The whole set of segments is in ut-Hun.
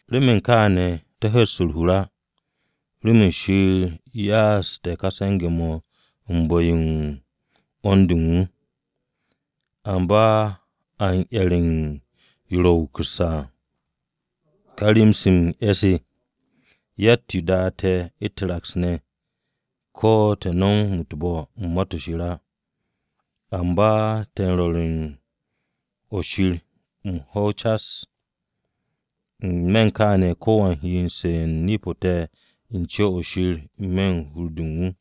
Remen kaane̱, te̱ hu̱s u̱r-hur á remen Shir ya'astu̱ te̱ kà se̱nge̱-mo̱ u̱n bu̱-yo u̱n 'wo̱n-de u̱n wu̱. Amba a 'yer yo ro̱ wukusse̱ à, ka rem-se m-'e̱ se. Yatt-yo da te̱ u̱t-raks ne̱, ko̱ te̱ nom u̱t-bo̱ u̱n Ma-to̱ Shir á. Amba te̱ m-rwo̱r u̱n o-Shir m-ho̱w cas. N-me̱ u̱n kaane̱ ko̱wan he m-su̱'e̱ nip-o te̱ u̱n co-o̱ Shir n-me̱ u̱n hur-de u̱n wu̱.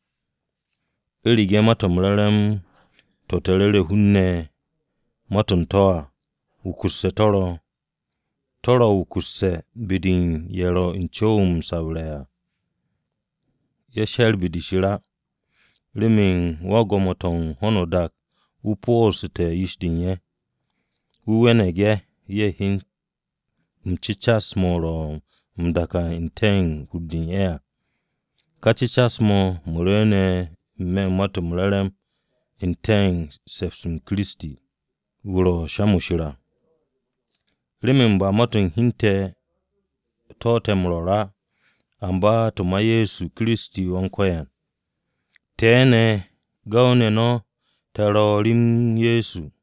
U̱rege̱ Ma-to̱ m-Re̱re̱m to̱ te̱ m-ru̱re̱ u̱n hun-ne̱ ma-to̱ u̱n to̱ à wukusse̱ to̱ ro̱, to̱ ro̱ wukusse̱ be-de u̱n ye̱ ro̱ u̱n co̱w-yo m-sabre̱ à. Ye̱ she̱r be-de Shir á, remen wan-gwo̱mo-to̱ u̱n ka ho̱no o-dak o̱ po̱o̱su̱te̱ hur-de u̱n ye̱. Wu̱ we̱ne̱g ye̱, ye̱ hyen m-cu̱cas mo̱ ro̱ m-dakan n-te̱ u̱n hur-de u̱n ye̱ à, ka cu̱cas-mo̱ ro̱ m-rwu̱u̱n n-me̱ u̱n Ma-to̱ m-Re̱re̱m n-te̱ u̱n se̱ps-m Kiristi, wu̱ ro̱ sha-mo̱ Shir à. Remen ba ma-to̱ u̱n hi u̱n te̱ to̱ te̱ m-rwo̱r á, amba to̱ ma Ye̱so Kiristi Wan-Ko̱yan. Te̱ ne̱ gu̱w-ne̱ no̱ te̱ ro̱ rem Ye̱so.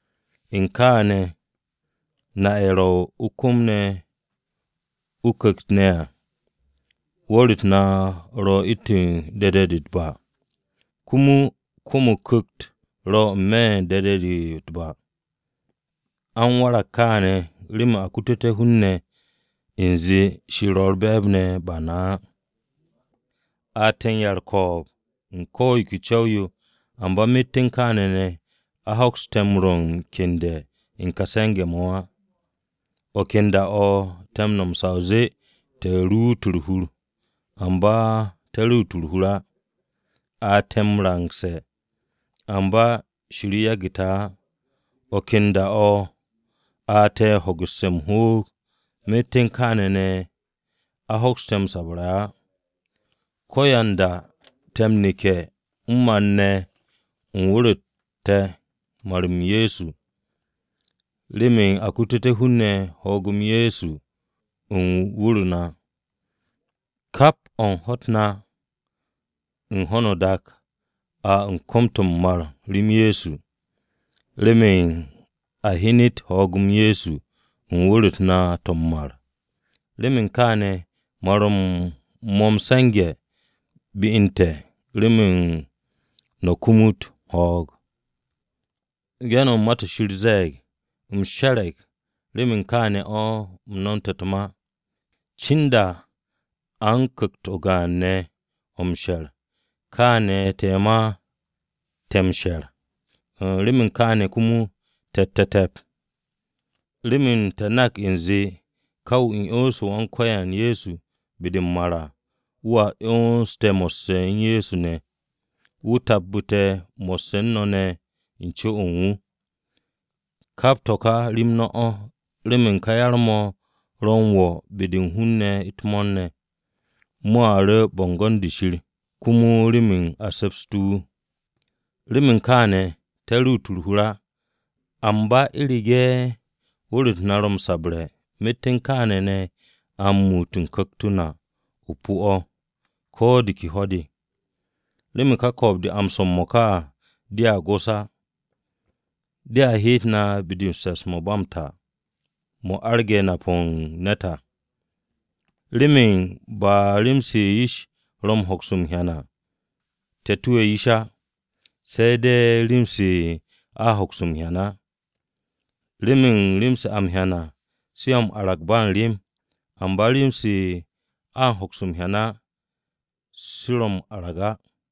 Myet u̱n kaane̱ ne̱, na ye̱ ro̱ o-kwu̱m o-Ku̱kt ne̱ à. Wu̱r-u̱t na ro̱ u̱ntu̱n tur-o̱ u̱t-ba, komo o-kwu̱m o-Ku̱kt ne̱ to̱ ro̱ n-me̱ tur-o̱ u̱t-ba. A u̱n warag kaane̱ remen a kututé̱ u̱nze Shir ro̱ u̱r-be̱e̱b ne̱, ba na á. A te̱ u̱n ya-u̱r-ko̱o̱b u̱n ko̱ yo ke co̱w-yo, amba myet u̱n kaane̱ ne̱, a hoks te̱ rwo̱ u̱r-kyende̱ u̱n ka se̱nge̱-mo̱ á. O̱ ken da-o̱ te̱ m-nom sa o zee te̱ ruut u̱r-hur, amba te̱ ruut u̱r-hur á. A te̱ m-rangse̱, amba Shir yagu̱ te̱ á. O̱ ken da-o̱ a te̱ hogu̱sse̱ m-hoog, myet u̱n kaane̱ ne̱ a hoks te̱ m-sabarse̱ á. Ko̱yanda te̱ m-neke̱ m-mar ne̱ u̱n wu̱r-u̱t te̱ mar-m Ye̱so, remen a kututé̱ hun-ne̱ ho̱o̱g-m Ye̱so u̱n wu̱r-u̱t na. Kap o̱ u̱n ho̱-u̱t na u̱n ho̱no o-dak a u̱n kom-to̱ m-mar rem Ye̱so, remen a hyenet ho̱o̱g-m Ye̱so u̱n wu̱r-u̱t na to̱ m-mar. Remen kaane̱, mar-m mo̱ m-se̱nge̱ be u̱n te̱, remen no̱ kumut ho̱o̱g. Ge̱n-mo̱ u̱n Ma-to̱ Shir ze̱e̱g, “U̱m she̱re̱g, remen kaane̱ o̱ u̱m nomte̱ u̱t-ma.” Cinda a u̱n ku̱kt-o gaan ne̱ o̱ m-she̱r, kaane̱ te̱ ma te̱ m-she̱r, remen kaane̱ komo te̱tte̱ te̱p. Remen te̱ nak u̱nze ka wu̱ 'yonse̱ Wan-Ko̱yan Ye̱so be-de u̱n m-mar à, wu̱a 'yons te̱ mo̱sse̱ u̱n Ye̱so ne̱, wu̱ tabbu̱ te̱ mo̱sse̱ u̱n no̱ ne̱ u̱n co-o u̱n wu̱. Kap to̱ ka remen no̱ o̱, remen ka yar-mo̱, mo̱ ro̱ m-wo̱ be-de u̱n hun-ne̱ u̱t-mo̱o̱r ne̱. Mo̱a ru̱ bo̱ngo̱n-de Shir, komo remen a se̱psté̱ wu̱. Remen kaane̱, te̱ ruut u̱r-hur á. Amba u̱rege̱ wu̱r-u̱t te̱ ro̱ m-sabre̱, myet u̱n kaane̱ ne̱ a u̱n muut u̱n ku̱kt-o na o̱ o-pu̱ o̱ ko̱ de ke ho̱-de. Remen ka ko̱o̱b-de a m-swo̱ m-mo̱ka à, dea go̱s á. Dea heet na be-de m-se̱ps mo̱ u̱n ba m-ta. Mo̱ arage̱ nap-o̱ u̱n ne̱t à. Remen ba rem-se yish ro̱ m-hoks m-hyan à, te̱ tuwe̱ yish á, se̱ de̱ u̱n rem-se a m-hoks m-hyan á. Remen rem-se a m-hyan à, se ro̱ m-arag ba u̱n rem, amba rem-se a m-hoks m-hyan á, se ro̱ m-arag á.